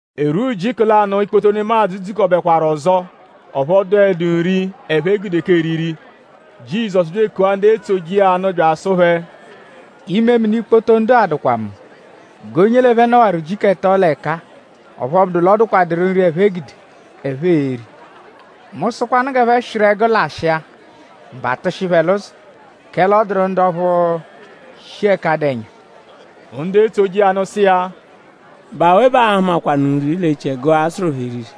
E rwua ujiku lanụ, ikpoto nemadzụ dzukọbekwaru ọzo; ọphu ọ dụhedu nri, ẹphe gude k'eriri. Jizọsu bya ekua ndu etsoje iya nụ bya asụ phẹ: “Imemini ikpoto ndu-a dụkwa mu g'onye l'ẹphe nọwaru ujiku ẹto l'ẹka-a; ọphu ọ bụdu l'ọ dụkwaduru nri, ẹphe gude, ẹphe e-ri. Mu -sụkwanu g'ẹphe swịru ẹgu lashịa; mba atụshi phẹ l'ụzo; kẹle ọ dụru ndu ọphu shi ẹka dụ ẹnya.” Ndu etsoje iya nụ sụ iya: “?Bụ awe bẹ aa-hụmakwanu nri l'echiẹgu-a, a-sụru phẹ eriri?”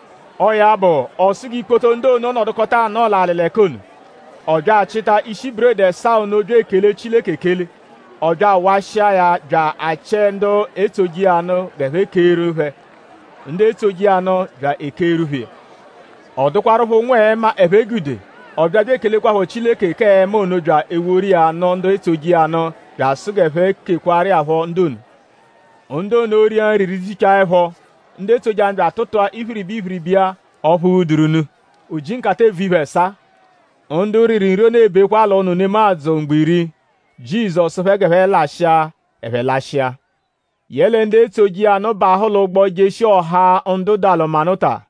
Ọo ya bụ; ọ sụ g'ikpoto ndu ono nọdukota anọo l'alị l'ẹka ono. Ọ bya achịta ishi buredi ẹsaa ono bya ekele Chileke ekele. Ọ bya awashịa ya bya achịe ndu etsoje iya nụ g'ẹphe keeru phẹ. Ndu etsoje iya nụ bya ekeeru phẹ iya. Ọ dụkwarupho ụnwu-ẹma, ẹphe gude. Ọ bya bya ekelekwaphọ Chileke k'ẹma ono bya eworu iya nụ ndu etsoje iya nụ bya asụ g'ẹphe kekwaaru iya phọ ndu ono. Ndu ono ria nri rijichaa ẹpho. Ndu etsoje iya nụ bya atụtua iphiriba iphiriba iya ọphu ghuduru nụ; o ji nkata-eevu-iphe ẹsaa. Ndu riru nri ono e-bekwa l'ụnu nemadzụ mgbo iri. Jizọsu sụ phẹ g'ẹphe lashịa; ẹphe lashịa. Yẹle ndu etsoje iya nụ bahụ l'ụgbo jeshia ọha ndu Dalumanuta.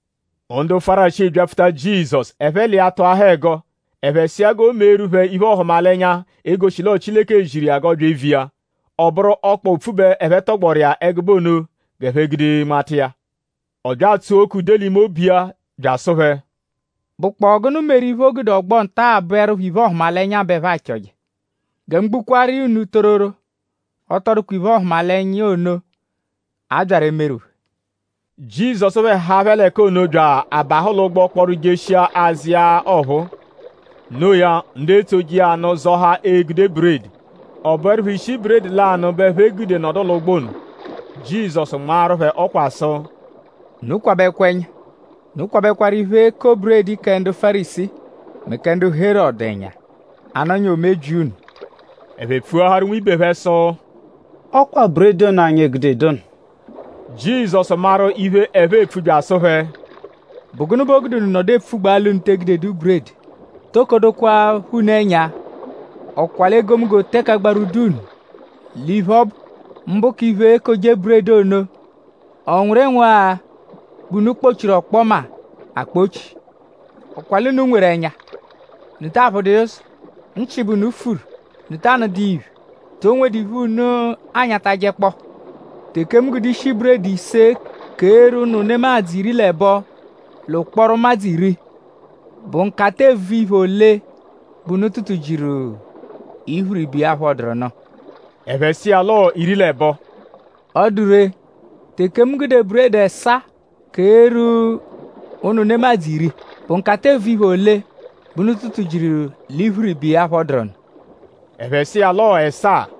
Ndu Fárisii byapfuta Jizọsu; ẹphe l'iya tụahaa ẹgo. Ẹphe sụ iya g'o meeru phẹ iphe-ọhumalenya, e-goshi l'ọo Chileke ziru iya g'ọ bya eviya. Ọ bụru ọkpa opfu bẹ ẹphe tọgboru iya ẹgube ono; g'ẹphe gude nmata iya. Ọ bya atsua oke ude l'ime obu bya asụ phẹ: “?Bụkpoo gụnu meru iphe, o gude ọgbo nta-a bụerupho iphe-ọhumalenya bẹ ẹphe achọje? Gẹ mu gbukwaru iya unu tororo; ọ tọ dụkwa iphe-ọhumalenya ono, a byaru emeru phẹ.” Jizọsu phẹ haa phẹ l'ẹka ono bya abahụ l'ụgbo kpọru jeshia azụ iya ọphuu. Noo ya; ndu etsoje iya nụ zọhaa egude buredi. Ọ bụerupho ishi buredi lanụ bẹ ẹphe gude nọdu l'ụgbo ono. Jizọsu nmaaru phẹ ọkwa sụ: “Unu kwabẹkwa ẹnya! Unu kwabẹkwaru iphe-eko-buredi kẹ ndu Fárisii mẹ kẹ Herọdu ẹnya; a -nọnyaa o mebyia unu.” Ẹphe pfuaharu nwibe phẹ sụ: “Ọ kwa buredi ono, anyi egudedu ono.” Jizọsu maru iphe, ẹphe epfu bya asụ phẹ: “?Bụ gụnu bẹ o gude unu nọdu epfugbaa l'unu te egudedu buredi??Toko dokwaphọ unu ẹnya??Ọ kwa l'egomunggo teke agbarwudu unu l'iphe, ọ bụ; mbụ k'iphe, ekoje-buredi ono??Ọ nwụru ịnwu-agha bẹ unu kpọ-chiru ọkpoma akpọ-chi? Ọ kwa l'unu nweru ẹnya;?Unu ta aphụdu iya ụzo? Nchị bẹ unu furu;?Unu ta anụdu iya iphe??To nwedu iphe, unu anyatajẹkpoo? Teke mu gude ishi buredi ise keeru ụnu nemadzụ iri l'ẹbo l'ụkporo ụmadzu iri;?bụ nkata-eevu-iphe ole bẹ unu tụtu-jiru iphiriba iya, phọduru nụ?” Ẹphe sụ iya l'ọo iri l'ẹbo. “Ọ dụ ree; teke mu gude buredi ẹsaa keeru ụnu nemadzụ iri;?bụ nkata-eevu-iphe ole bẹ unu tụtu-jiru l'iphiriba iya, phọduru nụ?” Ẹphe sụ iya l'ọo ẹsaa.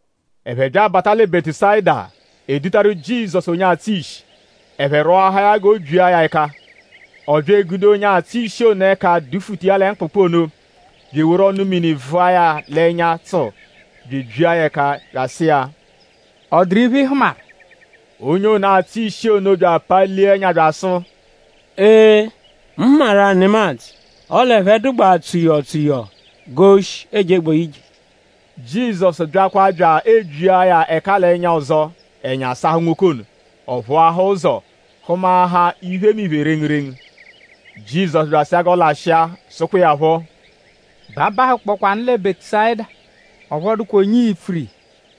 Ẹphe bya abata lẹ Bẹtusayida. E dutaru Jizọsu onye atsụ ishi. Ẹphe rwọahaa ya g'o byia ya ẹka. Ọ bya egude onye atsụ ishi ono ẹka dufuta iya lẹ mkpụkpu ono; bya eworu ọnu-mini vụa ya l'ẹnya tsụu; bya ebyia ya ẹka bya asụ iya: “?Ọ dụru iphe, ị hụmaru?” Onye ono, atsụ ishi ono palia ẹnya bya asụ: “Ee; mu hụmaru-a nemadzụ; ọle ẹphe dụgbaa tsuyọo tsuyọo g'oshi ejegbaa ije.” Jizọsu byakwa bya ebyia ya ẹka l'ẹnya ọzo. Ẹnya sahụ nwoke ono; ọ phụahaa ụzo; hụmaahaa iphemiphe rengurengu. Jizọsu bya asụ iya g'ọ lashịa; sụkwa iya phọ: “B'abahụkpokwanu lẹ Bẹtusayida; ọphu ọ dụkwa onye ii-pfuru iya.”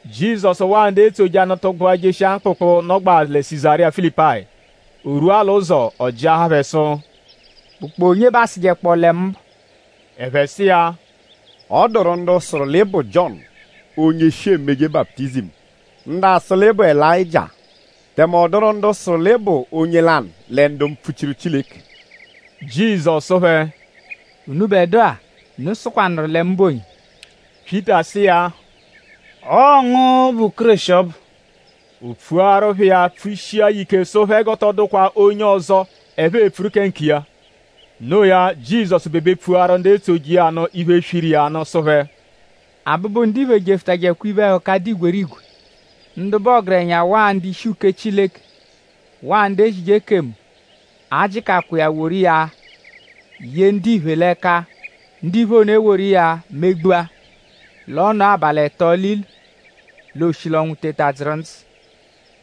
“Jizọsu waa ndu etsoje iya nụ tụgbua jeshia mkpụkpu, nọgbaa lẹ Sizariya Filipayi. O rwua l'ụzo; ọ jịahaa phẹ sụ:?Bụkpoo onye bẹ aasụjekpoo lẹ mu bụ?” Ẹphe sụ iya: “Ọ dụru ndu sụru l'ị bụ Jiọnu onye shi emeje baputizimu; ndu asụ l'ị bụ Elayịjia; tẹme ọ dụru ndu sụru l'ị bụ onye lanụ lẹ ndu mpfuchiru Chileke.” Jizọsu sụ phẹ: “Unubẹdua;?unu sụkwanuru lẹ mu bụ onye?” Pyịta sụ iya: “Ọo ngu bụ Kéreshi ọbu.” O pfuaru phẹ iya pfushia ya ike sụ phẹ g'ọ tọ dụkwa onye ọzo, ẹphe e-pfuru kẹ nkiya. Noo ya; Jizọsu bebe pfuaru ndu etsoje iya nụ iphe, swiru iya nụ sụ phẹ: “Abụbu-Ndiphe jefụtajekwa iphe-ẹhuka, dụ igwerigwe. Ndu bụ ọgerenya; waa ndu-ishi uke Chileke; waa ndu ezije ekemu a-jịkakwa iya woru iya ye ndiphe l'ẹka. Ndiphe ono eworu iya megbua; l'ọ nọo abalị ẹto l'ilu; l'ooshi l'ọnwu teta dzụru ndzụ.”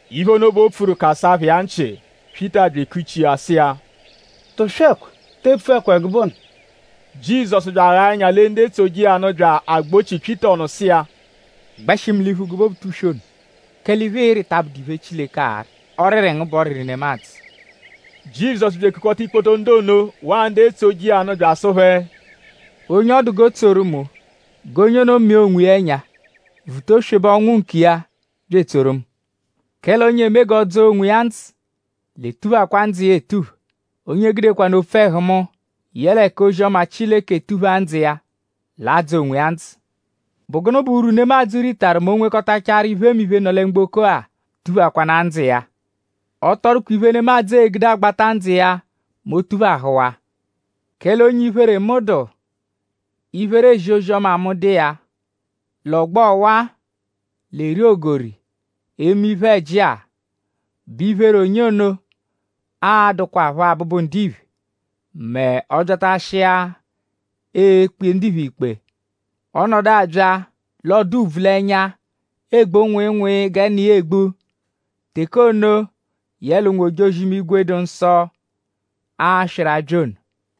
Iphe ono bẹ o pfuru phẹ kasaa phẹ iya nchị. Pyịta bya ekuchi iya sụ iya: “Tụswekwa! Te epfukwa ẹgube ono.” Jizọsu bya aghaa ẹnya bya elee ndu etsoje iya nụ bya agbochia Pyịta ọnu sụ iya: “Gbẹshi mu l'iphu gụbe Obutuswe ono! Kẹle iphe, ịiri ta abụdu iphe, Chileke arị. Ọriri ngu bụ ọriri nemadzụ.” Jizọsu bya ekukọta ikpoto ndu ono waa ndu etsoje iya nụ bya asụ phẹ: “Onye ọ dụ g'o tsoru mu g'onye ono mịa onwiya ẹnya; vuta oswebe ọnwu nkiya bya etsoru mu; kẹle onye eme g'ọ dzọo onwiya ndzụ l'e-tuphakwa ndzụ iya etupha. Onye gudekwanụ opfu ẹhu mu yẹle k'ozi-ọma Chileke tuphaa ndzụ iya l'a-dzọ onwiya ndzụ. ?Bụ gụnu bụ urwu, nemadzụ ritaru mẹ o -nwekọtachaaru iphemiphe, nọ lẹ mgboko-a; tuphakwanaa ndzụ iya? Ọ tọ dụkwa iphe, nemadzụ egude agbata ndzụ iya mẹ o -tuphahụwaa. Kẹle onye iphere mu dụ; iphere ezi ozi-ọma mu dụ iya; l'ọgbo ọwa, l'eri ogori eme iphe-ẹji-a; bẹ iphere onye ono a-dụkwapho Abụbu-Ndiphe mẹ ọ -byatashịepho ekpe ndiphe ikpe. Ọ -nọdu abya l'ọ dụ ùbvù l'ẹnya; egbu nwịinwii gẹ Nna iya egbu; teke ono, yẹle ụnwu-ojozi-imigwe, dụ nsọ a-swịru abya ono.”